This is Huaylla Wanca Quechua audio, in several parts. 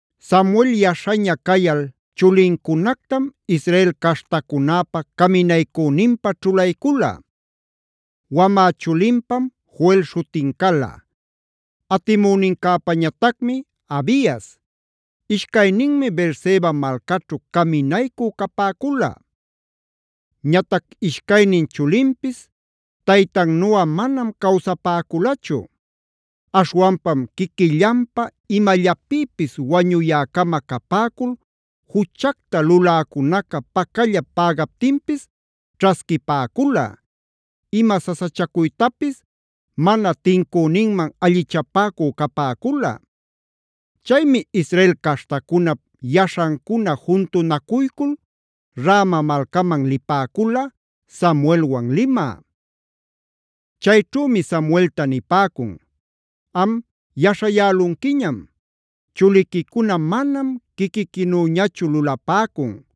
Samuel yaśhaña cayal chulincunactam Israel caśhtacunäpa caminaycüninpä ćhulaycula. Wamä chulinpam Joel śhutin cala, atimünincäpañatacmi Abias. Ishcayninmi Beerseba malcaćhu caminaycü capäcula. Ñatac ishcaynin chulinpis taytannuꞌa manam cawsapäculachu. Aśhwanpam quiquillanpä imallapïpis wañuyäcama capäcul, juchacta luläcunaca pacallap pägaptinpis ćhasquipäcula, ima sasachacuytapis mana tincüninman allichapäcü capäcula. Chaymi Israel caśhtacunap yaśhancuna juntunacuycul Rama malcaman lipäcula, Samuelwan limä. Chayćhümi Samuelta nipäcun: “Am yaśhayälunquiñam; chuliquicuna manam quiquiquinüñachu lulapäcun.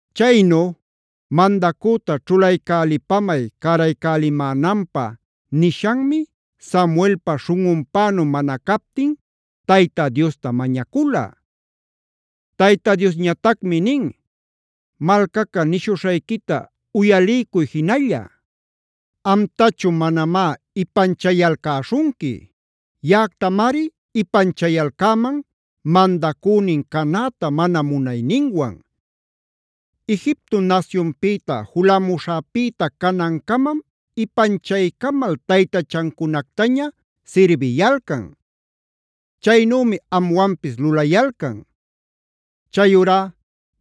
Chaynu “mandacüta ćhulaycälipamay cäraycälimänanpä” nishanmi Samuelpa śhunꞌunpänu mana captin Tayta Diosta mañacula. Tayta Diosñatacmi nin: “Malcaca nishuśhayquita uyaliycuy jinalla. Amtachu manamá ipanchayalcäśhunqui. Yaꞌactamari ipanchayalcäman mandacünin canäta mana munayninwan. Egipto nasyunpïta julamuśhäpïta canancamam ipanchaycamal taytachancunactaña sirbiyalcan. Chaynümi amwanpis lulayalcan. Chayurá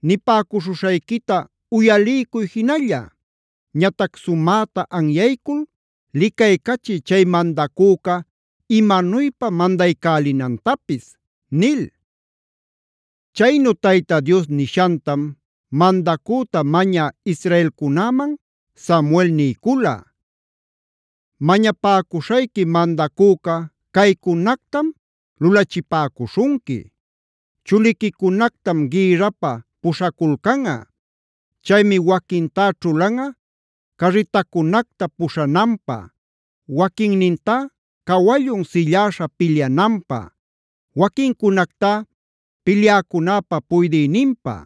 nipäcuśhuśhayquita uyaliycuy jinalla. Ñatac sumäta anyaycul licaycachiy chay mandacüca imanuypa mandaycälinantapis” nil. Chaynu Tayta Dios nishantam mandacüta mañä israelcunäman Samuel niycula: “Mañapäcuśhayqui mandacüca caycunactam lulachipäcuśhunqui: Chuliquicunactam gïrrapä puśhaculcanꞌa. Chaymi waquintá ćhulanꞌa carritacunacta puśhananpä, waquinnintá cawallun silläśha pilyananpä, waquincunactá pilyäcunäpä puydïninpä.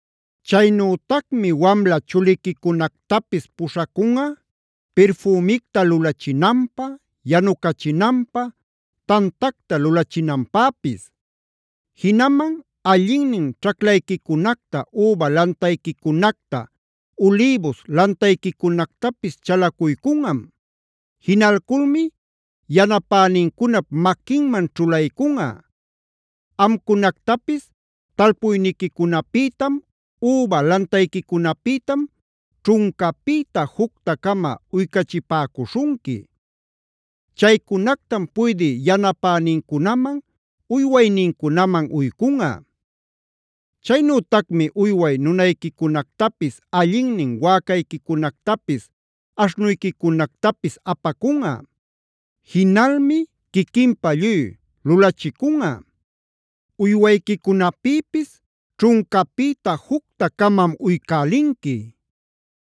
Chaynütacmi wamla chuliquicunactapis puśhacunꞌa pirfümicta lulachinanpä, yanucachinanpä, tantacta lulachinanpäpis. Jinaman allinnin ćhaclayquicunacta, üba lantayquicunacta, ulïbus lantayquicunactapis chalacuycunꞌam. Jinalculmi yanapänincunap maquinman ćhulaycunꞌa. Amcunactapis talpuyniquicunapïtam, üba lantayquicunapïtam ćhuncapïta jucta-cama uycachipäcuśhunqui. Chaycunactam puydï yanapänincunaman, uywaynincunaman uycunꞌa. Chaynütacmi uyway nunayquicunactapis, allinnin wäcayquicunactapis, aśhnuyquicunactapis apacunꞌa. Jinalmi quiquinpä lluy lulachicunꞌa. Uywayquicunapïpis ćhuncapïta jucta-camam uycälinqui;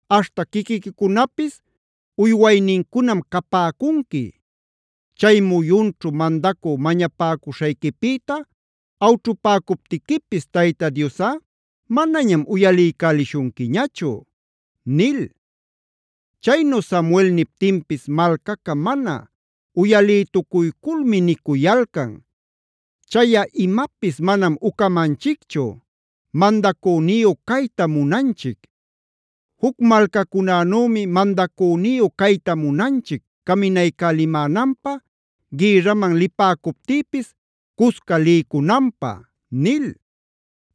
aśhta quiquiquicunapis uywaynincunam capäcunqui. Chay muyunćhu mandacü mañapäcuśhayquipïta awćhupäcuptiquipis Tayta Diosꞌa manañam uyaliycälishunquiñachu” nil. Chaynu Samuel niptinpis malcaca mana uyalïtucuyculmi nicuyalcan: “Chayꞌa imapis manam ucamanchicchu. Mandacüniyu caytam munanchic. Juc malcacunänümi mandacüniyu cayta munanchic caminaycälimänanpä, gïrraman lipäcuptïpis cusca liycunanpä” nil.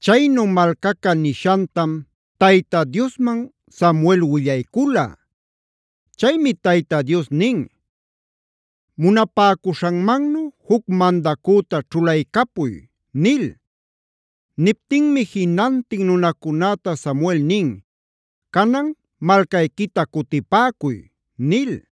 Chaynu malcaca nishantam Tayta Diosman Samuel willaycula. Chaymi Tayta Dios nin: “Munapäcuśhanmannu juc mandacüta ćhulaycapuy” nil. Niptinmi jinantin nunacunäta Samuel nin: “Canan malcayquita cutipäcuy” nil.